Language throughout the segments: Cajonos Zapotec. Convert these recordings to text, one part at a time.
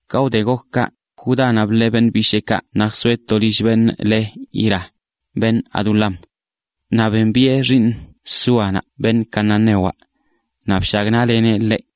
Ka wde gok kaꞌ, Judánaꞌ bḻee beṉꞌ bisheekaꞌ naꞌ zjsoeꞌ to lill beṉꞌ le Hira, beṉꞌ Adulam. Naꞌ bembiꞌe xiiṉ Súanaꞌ beṉꞌ cananewaꞌ, naꞌ bshagnaꞌleneꞌ ḻeꞌ.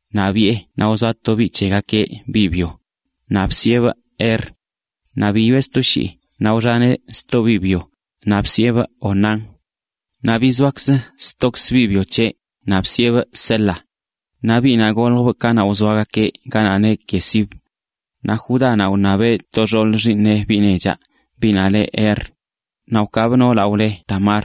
naꞌ biꞌe, naꞌ wzoa to biꞌ c̱hegakeꞌ, biꞌ byo, naꞌ bsiꞌebꞌ Er. Naꞌ biyoꞌe sto shii, naꞌ wxaneꞌ sto biꞌ byo, naꞌ bsiꞌebꞌ Onán. Naꞌ bizoa stokzə biꞌ byo c̱heꞌ, naꞌ bsiꞌebꞌ Sela naꞌ goljbꞌ kanaꞌ wzoagakeꞌ ganaꞌ neꞌ Quezib. Naꞌ Judánaꞌ wṉabe to xoolə xiiṉeꞌ biꞌ nechaꞌ, biꞌnaꞌ leꞌ Er. Naꞌ wkaabꞌ noolaꞌ wle Tamar.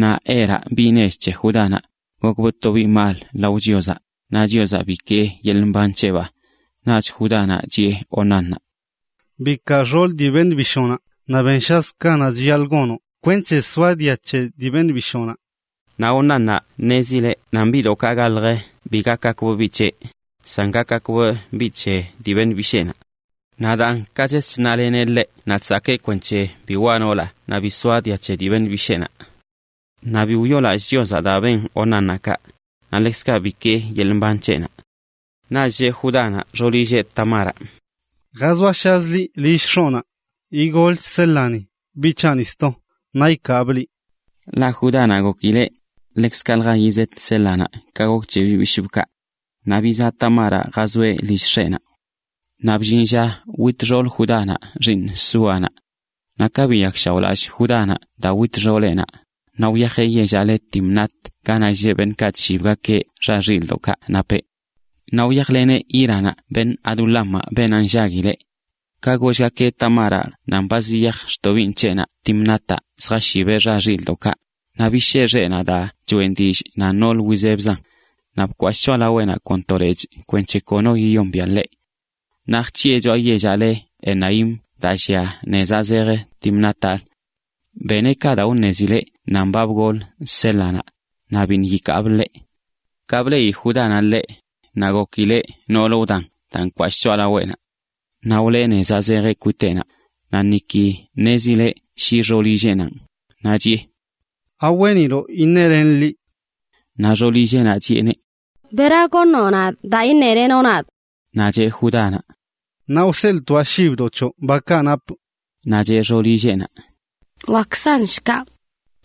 Naꞌ Eraꞌ, biꞌ nech c̱he Judánaꞌ, gokbꞌ to biꞌ mal lao Chiozaꞌ, naꞌ Chiozaꞌ bikee yeḻꞌ mban c̱heꞌbaa. Naꞌch Judánaꞌ chiꞌe Onánnaꞌ: ―Bikaa xool dii beṉꞌ bishoonaꞌ naꞌ benshazə ka chiyaḻꞌ gonoꞌ kwenc̱he soa dia c̱he dii beṉꞌ bishoonaꞌ. Naꞌ Onánnaꞌ ṉezileꞌ nan biꞌdoꞌkaꞌ galjə bi gakgakbꞌ biꞌ c̱heꞌ, san gakgakb biꞌ c̱he dii beṉꞌ bisheenaꞌ. Naꞌ daan ka ches chnaleneꞌ ḻeꞌ naꞌ chsakee kwenc̱he bi waꞌ noolaꞌ naꞌ bi soa dia c̱he dii beṉꞌ bisheenaꞌ. Naꞌ bi wyoolallꞌ Chiozaꞌ daa ben Onánnaꞌ kaꞌ, naꞌ ḻekzkaꞌ bikee yeḻꞌ mban c̱heꞌnaꞌ. Naꞌch cheꞌ Judánaꞌ xoolilleꞌ Tamaraꞌ: ―Jazoashazə liꞌ lill x̱oꞌnaꞌ. Igolch Sélani, biꞌ c̱haꞌni sto, naꞌ ikaabꞌ liꞌ. Ḻaꞌ Judánaꞌ gokileꞌ ḻekzkaꞌlja yizet Sélanaꞌ ka gok c̱he beṉꞌ bishꞌbꞌkaꞌ. Naꞌ bizaꞌ Tamaraꞌ jazoeꞌ lill x̱eꞌnaꞌ. Naꞌ bllin lla wit xoolə Judánaꞌ, xiiṉ Súanaꞌ. Naꞌ ka biyakshaoꞌlallꞌ Judánaꞌ daa wit xooleꞌnaꞌ, naꞌ wyajeꞌ yellaꞌ le Timnat ganaꞌ lleꞌ beṉꞌkaꞌ chshibgakeꞌ xa xilꞌdoꞌkaꞌ napeꞌ. Naꞌ wyajleneꞌ Híranaꞌ, beṉꞌ Adulamaꞌ, beenaꞌ nllaguileꞌ. Ka gollgakeꞌ Tamáraꞌ nan ba ziyaj xtobiiṉ c̱heꞌnaꞌ Timnátaꞌ zjashibeꞌ xa xilꞌdoꞌkaꞌ, naꞌ bishee xeꞌnaꞌ daa choꞌen dillꞌ nan noolə wizebzan, naꞌ bkwashꞌ choꞌalaweꞌnaꞌ kon to lechꞌ kwenc̱he kono yiyombiaꞌ ḻeꞌ. Naꞌ jc̱hiꞌe choꞌa yellaꞌ le Enaim daa llia tnezaꞌ zej Timnátalə. Beneꞌ kaꞌ daa wṉezileꞌ nan ba bgol Sélanaꞌ, naꞌ biṉꞌ yikaabꞌ ḻeꞌ. Ka bleꞌi Judánaꞌ ḻeꞌ, naꞌ gokileꞌ noolə wdan daa nkwashꞌ choꞌalaweꞌnaꞌ. Naꞌ wḻee nezaꞌ zejeꞌ kwiteꞌnaꞌ, naꞌ niki ṉezileꞌ shi xoolilleꞌnanꞌ. Naꞌ chiꞌe: ―¿Aweeniloꞌ iṉelenꞌ liꞌ? Naꞌ xoolilleꞌnaꞌ chiꞌeneꞌ: ―¿Bera goṉoꞌ nadꞌ daa iṉelenoꞌ nadꞌ? Naꞌ cheꞌ Judánaꞌ: ―Naꞌ wseḻꞌtoaꞌ shibdoꞌ c̱hoꞌ bakaꞌ napꞌ. Naꞌ cheꞌ xoolilleꞌnaꞌ: ―Wakzan shkaꞌ.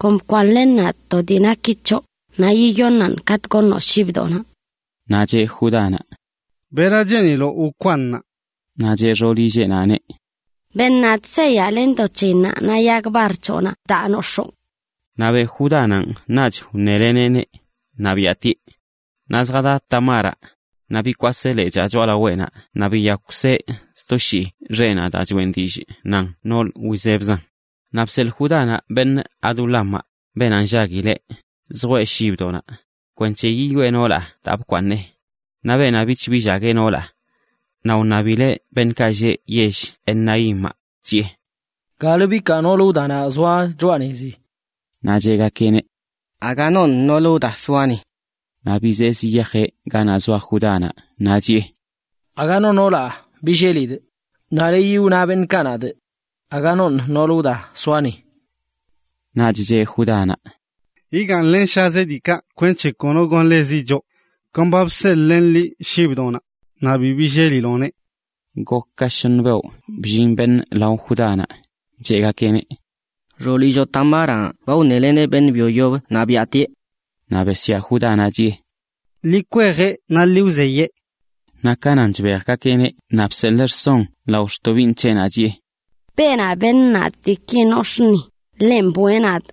Kon bkwaaṉlen nadꞌ to dii naki c̱hoꞌ, naꞌ yiyoṉaꞌn katꞌ goṉoꞌ shibdoꞌnaꞌ. Naꞌ cheꞌ Judánaꞌ: ―¿Bera cheeniloꞌ wkwaaṉaa? Naꞌ cheꞌ xoolilleꞌnaꞌneꞌ: ―Beṉ nadꞌ seyaꞌ len do c̱heyinnaꞌ, naꞌ yag bar c̱hoꞌnaꞌ daa noxoo. Naꞌ beꞌ Judánaꞌn, naꞌch wṉeleneꞌneꞌ, naꞌ biꞌatieꞌ. Naꞌ zjada Tamaraꞌ, naꞌ bikwaseꞌ lechaa choꞌalaweꞌnaꞌ naꞌ biyakweꞌ sto shii xeꞌnaꞌ daa choꞌen dillꞌ nan noolə wizebzan. Naꞌ bseḻꞌ Judánaꞌ beṉꞌ Adulamaꞌ, beenaꞌ nllaguileꞌ, zjwee shibdoꞌnaꞌ, kwenc̱he yiyoꞌe noolaꞌ daa bkwaaṉꞌleneꞌneꞌ. Naꞌ beenaꞌ bich bllagueꞌ noolaꞌ. Naꞌ wṉabileꞌ beṉꞌkaꞌ lleꞌ yell Enaimaꞌ, chiꞌe: ―¿Galə bikaa noolə wdanaꞌ wzoa choꞌa nezi? Naꞌ cheꞌgakeꞌneꞌ: ―Aga noṉꞌ noolə wda soa ni. Naꞌ bizee ziyajeꞌ ganaꞌ zoa Judánaꞌ, naꞌ chiꞌe: ―Aga no noolaꞌ billelidꞌ, naꞌ leyi wna beṉꞌkaꞌ nadꞌ: “Aga noṉꞌ noolə wda zoa ni.” Naꞌch cheꞌ Judánaꞌ: ―Yigaaṉlenshazeꞌ diikaꞌ kwenc̱he kono gonḻezi choꞌ. Kon ba bseḻꞌlenꞌ liꞌ shibdoꞌnaꞌ, naꞌ bi billeliloꞌneꞌ. Gok ka shoṉə beoꞌ bllin beṉꞌ lao Judánaꞌ, cheꞌgakeꞌneꞌ: ―Xoolilloꞌ Tamaraꞌ ba wṉeleneꞌ beṉꞌ byo yoblə naꞌ biaꞌtieꞌ. Naꞌ besyaa Judánaꞌ, chiꞌe: ―¡Ḻi kwejeꞌ naꞌ ḻi wzeyee! Naꞌ ka nan chbejgakeꞌneꞌ naꞌ bseḻee rson lao xtobiiṉ c̱heꞌnaꞌ, chiꞌe: “Beenaꞌ beṉ nadꞌ diiki nox̱aa ni, ḻenꞌ bwee nadꞌ.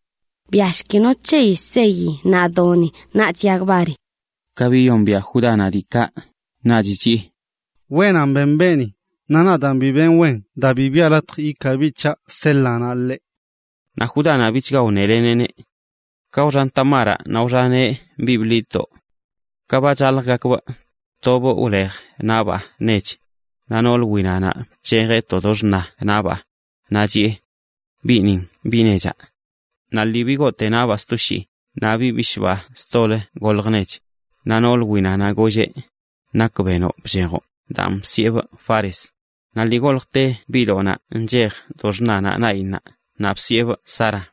Bwiashki no c̱heyi seyi naꞌ doni, naꞌch yag bari.” Ka biyombiaꞌ Judánaꞌ diikaꞌ, naꞌch wneꞌ: “Wenan ben beeni, naꞌ nadaan bi benꞌ wen daa bi biꞌa latj ikaa biꞌ c̱haꞌ Sélanaꞌ ḻeꞌ.” Naꞌ Judánaꞌ, bichga gotꞌleneꞌ ḻeꞌ. Ka wxan Tamaraꞌ naꞌ wxaneꞌ biꞌ bḻidꞌdoꞌ. Ka ba chaljgakbꞌ, tobꞌ wlej naꞌbaa nech, naꞌ noolə winanaꞌ bc̱hejeꞌ to do xṉa naꞌbaa, naꞌ chiꞌe: “Biꞌnin biꞌ nechaꞌ.” Naꞌ lii bigoote naꞌbaa sto shii, naꞌ biꞌ bishꞌbaa stolə golj nech. Naꞌ noolə winanaꞌ golleꞌ: “¿Nak benoꞌ bchejoꞌ?” Daan bsiꞌebꞌ Fares. Naꞌ lii goljte biꞌdoꞌnaꞌ bc̱hejeꞌ do xṉanaꞌ naꞌyinnaꞌ, naꞌ bsiꞌebꞌ Zara.